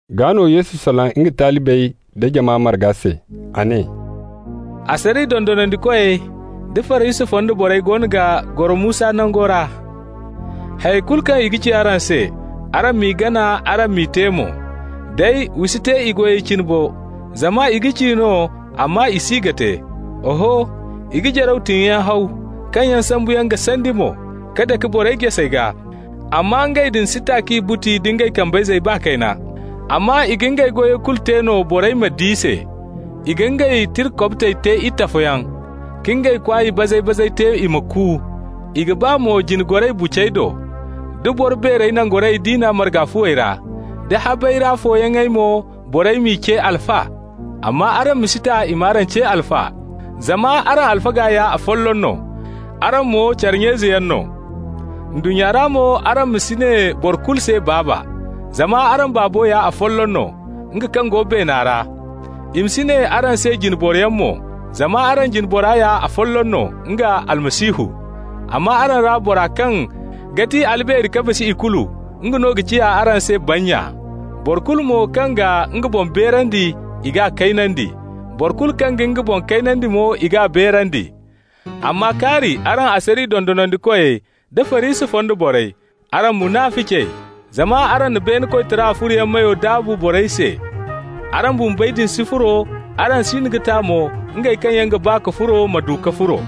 Gaa no Yesu salaŋ nga talibey da jama marga se. A ne: «Asariya dondonandikoy da Farisi fonda borey goono ga goro Musa nango ra. Hayey kulu kaŋ i ga ci araŋ se, araŋ m'i gana, araŋ m'i te mo. Day wa si te i goyey cine bo, zama i ga ci no, amma i si ga te. Oho, i ga jaraw tiŋoyaŋ haw, kaŋ yaŋ sambuyaŋ ga sandi mo, ka dake borey jasey gaa, amma ngey din si ta k'i buti nda ngey kambayzey baa kayna. Amma i ga ngey goyey kulu te no borey ma di se. I ga ngey tira kobtey te itafoyaŋ, ka ngey kwaay bazay-bazey te i ma ku. I ga ba mo jine goray bucey do, da boro beerey nangorayey diina marga fuwey ra, da habey ra fooyaŋey mo, borey m'i ce Alfa. Amma araŋ ma si ta i m'araŋ ce Alfa, zama araŋ alfaga ya afolloŋ no, araŋ mo care nya-izeyaŋ no. Ndunnya ra mo araŋ ma si ne boro kulu se Baaba, zama araŋ Baabo ya afolloŋ no, nga kaŋ go beena ra. I ma si ne araŋ se jine boroyaŋ mo, zama araŋ jine bora ya afolloŋ no, nga Almasihu. Amma araŋ ra bora kaŋ ga ti albeeri ka bisa ikulu, nga no ga ciya araŋ se bannya. Boro kulu mo kaŋ ga nga boŋ beerandi, i g'a kaynandi. Boro kulu kaŋ ga nga boŋ kaynandi mo, i g'a beerandi. Amma kaari araŋ asariya dondonandikoy da Farisi fonda borey, araŋ munaficey! Zama araŋ na beene koytara furoyaŋ meyo daabu borey se. Araŋ bumbey din si furo, araŋ siino ga ta mo ngey kaŋ yaŋ ga ba ka furo ma du ka furo.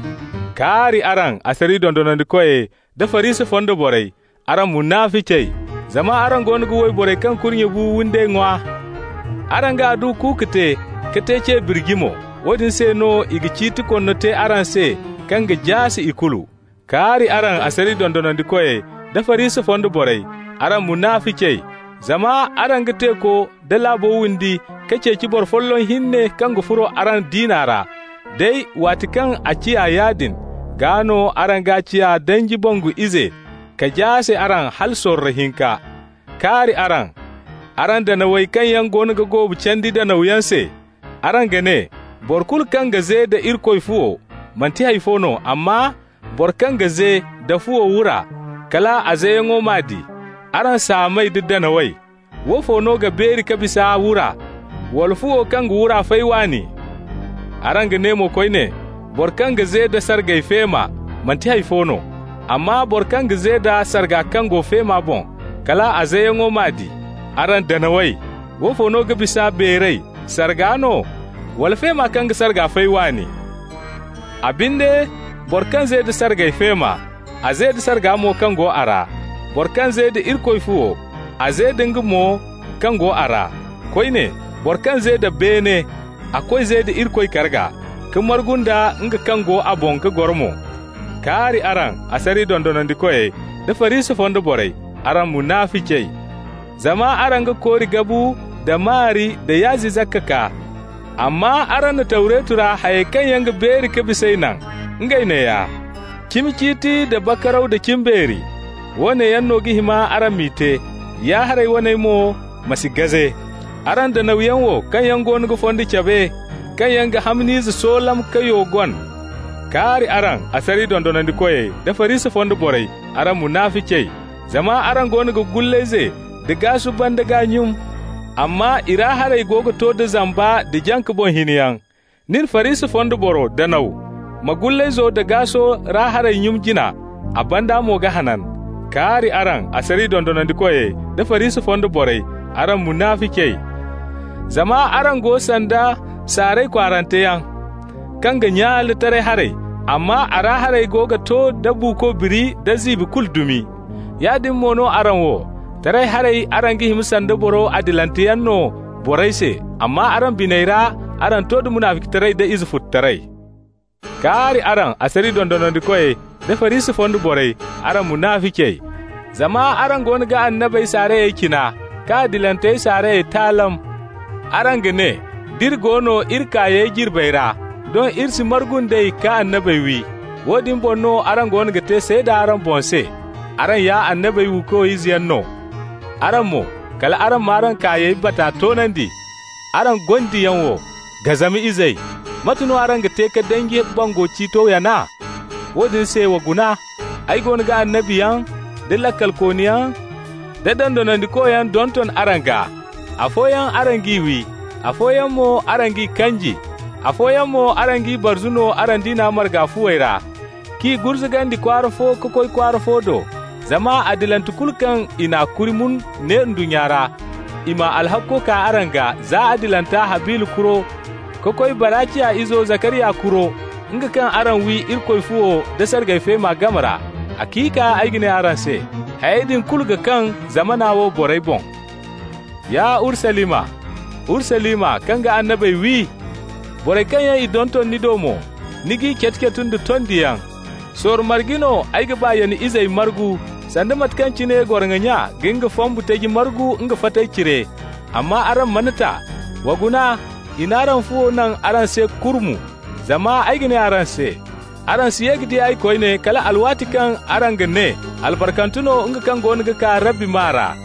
Kaari araŋ, asariya dondonandikoy nda Farisi fonda borey, araŋ munaficey! Zama araŋ goono ga wayborey kaŋ kurnye bu windey ŋwa. Araŋ ga adduwa kuuku te ka te ce birji mo. Woodin se no i ga ciiti konno te araŋ se kaŋ ga jaase ikulu. Kaari araŋ, asariya dondonandikoy da Farisi fonda borey, araŋ munaficey! Zama araŋ ga teeko da laabo windi ka ceeci boro folloŋ hinne kaŋ ga furo araŋ diina ra. Day waati kaŋ a ciya yaadin, gaa no araŋ g'a ciya danji bangu ize ka jaase araŋ hala sorro hinka. Kaari araŋ, araŋ danawey kaŋ yaŋ goono ga goobu candi danawyaŋ se! Araŋ ga ne: ‹Boro kulu kaŋ ga ze da Irikoy fuwo, manti hay fo no, amma boro kaŋ ga ze da fuwo wura, kal a zeyaŋo m'a di.› Araŋ saamey da danawey! Woofo no ga beeri ka bisa, wura, wala fuwo kaŋ ga wura fay waani? Araŋ ga ne mo koyne: ‹Boro kaŋ ga ze da sargay feema, manti hay fo no, amma boro kaŋ ga ze da sarga kaŋ go feema boŋ, kal a zeyaŋo m'a di.› Araŋ danawey! Woofo no ga bisa beeray, sarga no, wala feema kaŋ ga sarga fay waani? A binde, boro kaŋ ze da sargay feema, a ze da sarga mo kaŋ go a ra. Boro kaŋ ze da Irikoy fuwo, a ze da nga mo kaŋ go a ra. Koyne, boro kaŋ ze da beene, a koy ze da Irikoy karga, ka margu nda nga kaŋ go a boŋ ga goro mo. Kaari araŋ, asariya dondonandikoy da Farisi fonda borey, araŋ munaficey! Zama araŋ ga kori gabu da maari da yaazi zakka kaa, amma araŋ na Tawretu ra hayey kaŋ yaŋ ga beeri ka bis'ey naŋ, ngey neeya: cimi ciiti nda bakaraw da cimbeeri. Woone yaŋ no ga hima araŋ m'i te, ya-haray waney mo ma si gaze. Araŋ danawyaŋ wo kaŋ goono ga fondo cabe, kaŋ yaŋ ga hamn'ize soolam ka yo gon! Kaari araŋ, asariya dondonandikoy da Farisi fonda borey, araŋ munaficey! Zama araŋ goono ga gullayze da gaasu banda gaa nyun, amma i ra haray go ga to da zamba da jaŋ-ka-boŋ-hinay. Nin, Farisi fonda boro, danaw, ma gullayzo da gaaso ra haray nyun jina, a banda mo ga hanan. Kaari araŋ, asariya dondonandikoy da Farisi fonda borey, araŋ munaficey! Zama araŋ go sanda saaray kwaaranteyaŋ, kaŋ ga nyaale taray haray, amma a ra haray ga to da buuko biri da ziibi kulu dumi. Yaadin mo no araŋ wo. Taray haray araŋ ga hima sanda boro adilanteyaŋ no borey se, amma araŋ biney ra araŋ to da munaficitaray da izefututaray. Kaari araŋ, asariya dondonandikoy nda Farisi fonda borey, araŋ munaficey! Zama araŋ goono ga annabey saarayey cina, ka adilantey saarayey taalam. Araŋ ga ne: ‹D'iri go no iri kaayey jirbey ra, doŋ iri si margu nd'ey ka annabey wi.› Woodin boŋ no araŋ goono ga te seeda araŋ boŋ se, araŋ ya annabey wiikoy izeyaŋ no. Araŋ mo, kal araŋ m'araŋ kaayey bata toonandi. Araŋ gondiyaŋ wo, gazama izey! Mate no araŋ ga te ka danji bangu ciito yana? Woodin se, wa guna. Ay goono ga annabiyaŋ da laakalkooniyaŋ da dondonandikoyaŋ donton araŋ gaa. Afooyaŋ araŋ g'i wi, afooyaŋ mo araŋ g'i kanji. Afooyaŋ mo araŋ g'i barzu no araŋ diina marga fuwey ra, k'i gurzugandi kwaara fo ka koy kwaara fo do. Zama adilante kulu kaŋ i n'a kuri mun ne ndunnya ra, i m'a alhakko kaa araŋ gaa, za adilanta Habila kuro ka koy Baraciya izo Zakariya kuro, nga kaŋ araŋ wi Irikoy fuwo da sargay feema game ra. Haciika ay ga ne araŋ se: hayey din kulu ga kaŋ zamana wo borey boŋ. Ya Urusalima, Urusalima, kaŋ ga annabey wi! Borey kaŋ yaŋ i donton ni do mo, ni g'i catu-catu nda tondiyaŋ! Sorro marge no ay ga ba ya ni izey margu, sanda mate kaŋ cine goroŋo nya ga nga fambu taji margu nga fatey cire, amma araŋ mana ta! Wa guna, i n'araŋ fuwo naŋ araŋ se kurmu. Zama ay ga ne araŋ se: Araŋ si ye ka di ay koyne kal alwaati kaŋ araŋ ga ne: ‹Albarkante no nga kaŋ goono ga kaa Rabbi maa ra.›»